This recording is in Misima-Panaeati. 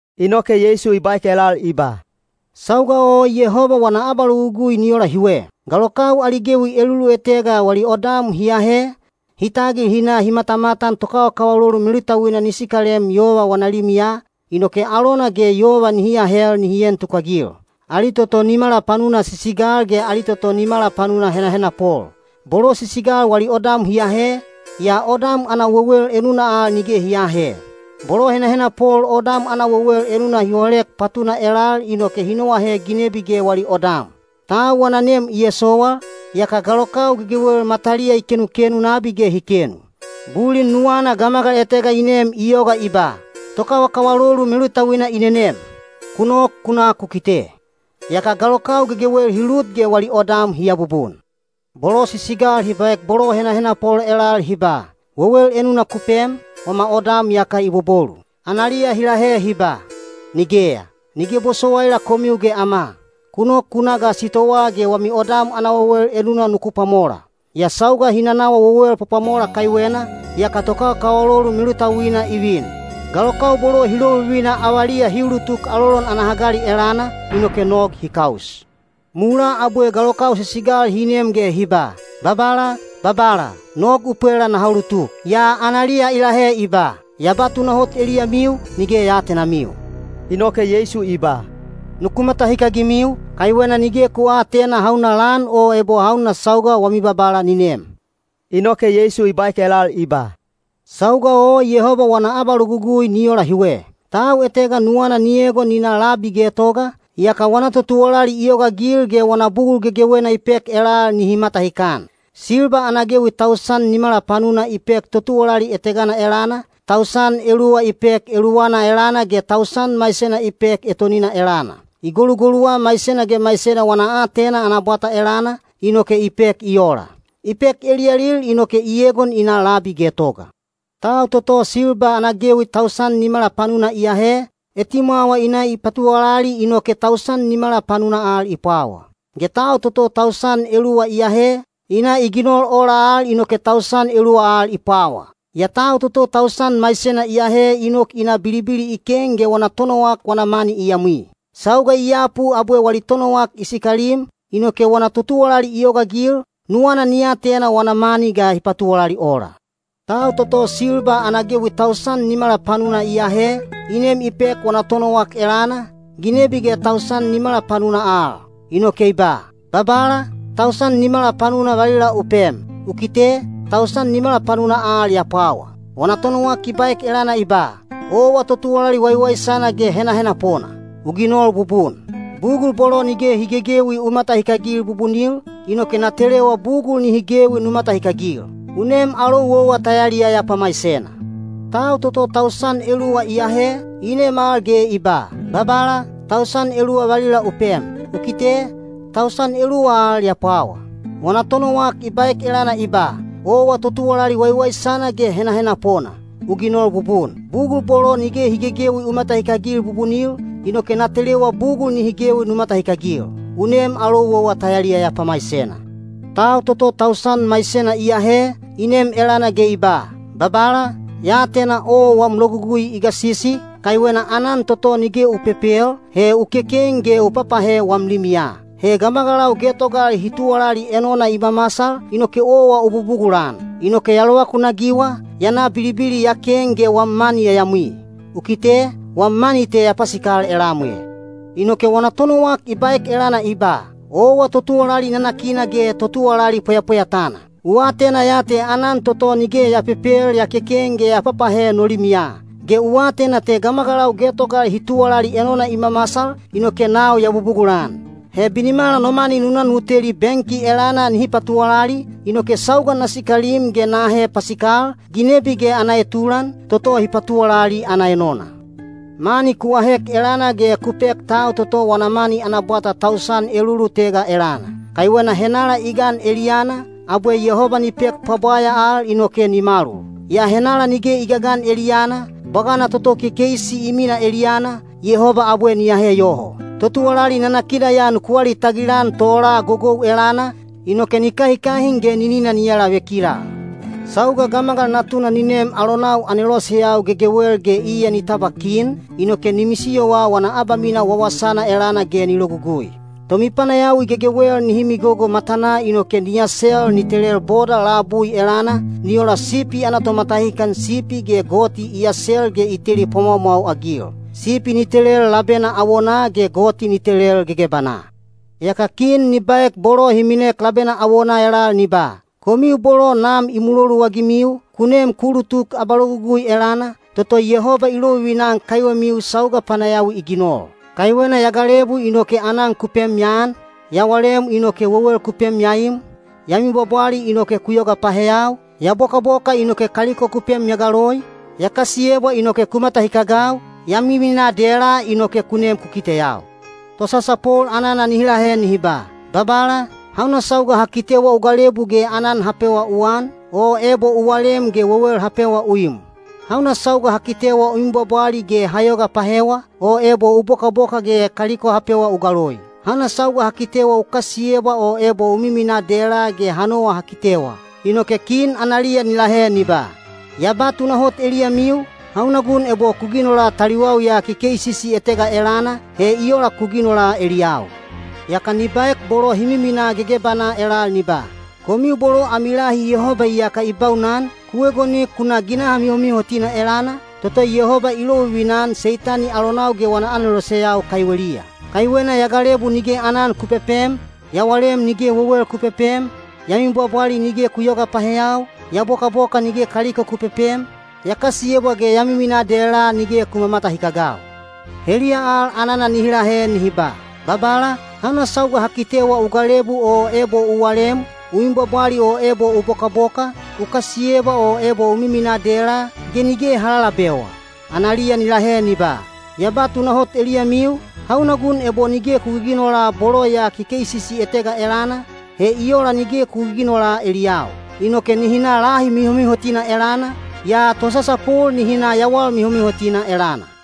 Inoke Yeisu i baek elal i ba, “Sauga o Yehoba wana abalogugui ni ola hiwe. Galokau ali gewi elulutega wali odam hi ahe, hi tagil hi na hi matamatan tokawakawalolu melutauina ni sikalem yova wana limiya, inoke alona ge yova nihi ahel nihi en tukagil. Ali toto nimala panuna sisigal ge ali toto nimala panuna henahenapol. Bolo sisigal wali odam hi ahe, yaa odam ana wewel enuna al nige hi aahe. Bolo henahenapol odam ana wewel enuna hi holek patuna elal inoke hi noahe ginebi ge wali odam. Tau wana nem i esowal, yaka galokau gegewel mataliya i kenukenu nabi ge hi kenu. Bulin nuwana gamagal etega i nem i yoga i ba, ‘Tokawakawalolu melutauina i nenem. Ku nok ku na ku kite.’ Yaka galokau gegewel hi lut ge wali odam hi abubun. Bolo sisigal hi baek bolo henahenapol elal hi ba, ‘Wewel enuna ku pem, wama odam iyaka i bobolu.’ Analiya hi lahe hi ba, ‘Nigeya. Nige bosowaila komiu ge ama. Ku nok ku na ga sitowaa ge wami odam ana wewel enuna nuku pwamola.’ Yaa sauga hi nanawa wewel pwapwamola kaiwena, yaka tokawakawalolu melutauina i vin. Galokau bolo hi lovivina avaliya hi ulutuk alolon ana hagali elana, inoke nog hi kaus. Mulaa abwe galokau sisigal hi nem ge hi ba, ‘Babala, babala, nog u pwela naha ulutuk.’ Yaa analiya i lahe i ba, ‘Ya ba tunahot eliyamiu, nige ya aatenamiu.’” Inoke Yeisu i ba, “Nuku matahikagimiu, kaiwena nige ku aatena hauna lan o ebo hauna sauga wami Babala ni nem.” Inoke Yeisu i baek elal i ba, “Sauga o Yehoba wana abalogugui ni ola hiwe. Tau etega nuwana ni egon ni na labi getoga, yaka wana totuwalali i yogaagil ge wana bugul gegewena i pek elal nihi matahikan. Silba ana gewi tausan nimala panuna i pek totuwalali etegana elana, tausan eluwa i pek eluwana elana ge tausan maisena i pek etonina elana. I golugoluwa maisena ge maisena wana aatena ana bwata elana, inoke i pek i ola. I pek eliyalil inoke i egon i na labi getoga. Tau toto silba ana gewi tausan nimala panuna i ahe, etimwawa i na i patuwalali inoke tausan nimala panuna al i pwawa. Ge tau toto tausan eluwa i ahe, i na i ginol ola al inoke tausan eluwa al i pwawa. Yaa tau toto tausan maisena i ahe i nok i na bilibili i ken ge wana tonowak wana mani i yamwi. Sauga i yapu abwe wali tonowak i sikalim, inoke wana totuwalali i yogaagil, nuwana ni atena wana mani ga hi patuwalali ola. Tau toto silba ana gewi tausan nimala panuna i ahe, i nem i pek wana tonowak elana, ginebi ge tausan nimala panuna al. Inoke i ba, ‘Babala, tausan nimala panuna valila u pem. U kite, tausan nimala panuna al ya pwawa.’ Wana tonowak i baek elana i ba, ‘Owa totuwalali waiwaisana ge henahenapona. U ginol bubun. Bugul bolo nige hi gegewi u matahikagil bubunil, inoke na telewa bugul nihi gewi nu matahikagil. U nem alou owa ta yaliyaya pamaisena.’ Tau toto tausan eluwa i ahe, i nem al ge i ba, ‘Babala, tausan eluwa valila u pem. U kite, tausan eluwa al ya pwawa.’ Wana tonowak i baek elana i ba, ‘Owa totuwalali waiwaisana ge henahenapona. U ginol bubun. Bugul bolo nige hi gegewi u matahikagil bubunil, inoke na telewa bugul nihi gewi nu matahikagil. U nem alou owa ta yaliyaya pamaisena.’ Tau toto tausan maisena i ahe, i nem elana ge i ba, ‘Babala, ya atena owa wam logugui i gasisi, kaiwena aanan toto nige u pepel, he u keken ge u papahe wam limiya. He gamagalau getogal hi tuwalali enona i mamasal, inoke owa u bubugulan. Inoke ya lovakunagiwa, ya na bilibili ya ken ge wam mani ya yamwi. U kite, wam mani te ya pasikal elam e.’ Inoke wana tonowak i baek elana i ba, ‘Owa totuwalali nanakina ge totuwalali pweyapweyatana. U atena ya te aanan toto nige ya pepel ya keken ge ya papahe no limiya. Ge u atena gamagalau getogal hi tuwalali enona i mamasal, inoke nau ya bubugulan. He binimala nu na no mani nu teli benki elana nihi patuwalali, inoke sauga na sikalim ge na ahe pasikal, ginebi ge ana etulan, toto hi patuwalali ana enona. ‘Mani ku ahek elana ge ku pek tau toto wana mani ana bwata tausan elulutega elana. Kaiwena henala i gan eliyana, abwe Yehoba ni pek pwabwaya al inoke ni malul. Yaa henala nige i gagan eliyana, bwagana toto kekeisi i minaa eliyana, Yehoba abwe ni ahe yoho. Totuwalali nanakina ya nuku alitagil-an tola gogou elana, inoke ni kahikahin ge ninina ni alavekilal.’ Sauga Gamagal Natuna ni nem alonau aneloseyau gegewel ge iya ni tabwa kin, inoke ni misiyowa wana abamisiyo wawasana elana ge ni logugui. Tomipanayawi gegewel nihi migogo matanaa inoke ni asel ni telel boda labui elana, ni ola sipi ana tomatahikan sipi ge goti i asel ge i teli pwamwaumwau-agil. Sipi ni telel labena awonaa ge goti ni telel gegebanaa. Yaka kin ni baek bolo hi minek labena awonaa elal ni ba, ‘Komiu bolo Nam i muloluagimiu, ku nem ku ulutuk abalogugui elana, toto Yehoba i lovivina-an kaiwemiu sauga panayawi i ginol. Kaiwena ya galebu inoke aanan ku pem ya an, ya walem inoke wewel ku pem ya im, ya mibwabwali inoke ku yoga paheyau, ya bokaboka inoke kaliko ku pem ya galoi, ya kasiyebwa inoke ku matahikagau, ya miminaa dela inoke ku nem ku kiteyau.’ Tosasapol anana nihi lahe nihi ba, ‘Babala, hauna sauga ha kitewa u galebu ge aanan ha pewa u an, o ebo u walem ge wewel ha pewa u im? Hauna sauga ha kitewa u mibwabwali ge ha yoga pahewa, o ebo u bokaboka ge kaliko ha pewa u galoi? Hauna sauga ha kitewa u kasiyebwa o ebo u miminaa dela ge ha nowa ha kitewa?’ Inoke analiya kin ni lahe ni ba, ‘Ya ba tunahot eliyamiu, hauna gun ebo ku ginola taliwau ya kekeisisi etega elana, he i ola ku ginola eliyau.’ Yaka ni baek bolo hi miminaa gegebanaa elal ni ba, ‘Komiu bolo ami lahi Yehoba iyaka i baunan, ku egonik ku na ginaha mihomihotina elana, toto Yehoba i lovivina-an Seitani alonau ge wana aneloseyau kaiweliya. Kaiwena ya galebu nige aanan ku pepem, ya walem nige wewel ku pepem, ya mibwabwali nige ku yoyoga paheyau, ya bokaboka nige kaliko ku pepem, ya kasiyebwa ge ya miminaa dela nige ku mamatahikagau.’ Heliya al anana nihi lahe nihi ba, ‘Babala, hauna sauga ha kitewa u galebu o ebo u walem, u mibwabwali o ebo u bokaboka, u kasiyebwa o ebo u miminaa dela, ge nige ha lalabewa?’ Analiya ni lahe ni ba, ‘Ya ba tunahot eliyamiu, hauna gun ebo nige ku giginola bolo ya kekeisisi etega elana, he i ola nige ku giginola eliyau.’ Inoke nihi na lahi mihomihotina elana, yaa tosasapol nihi na yawal mihomihotina elana.”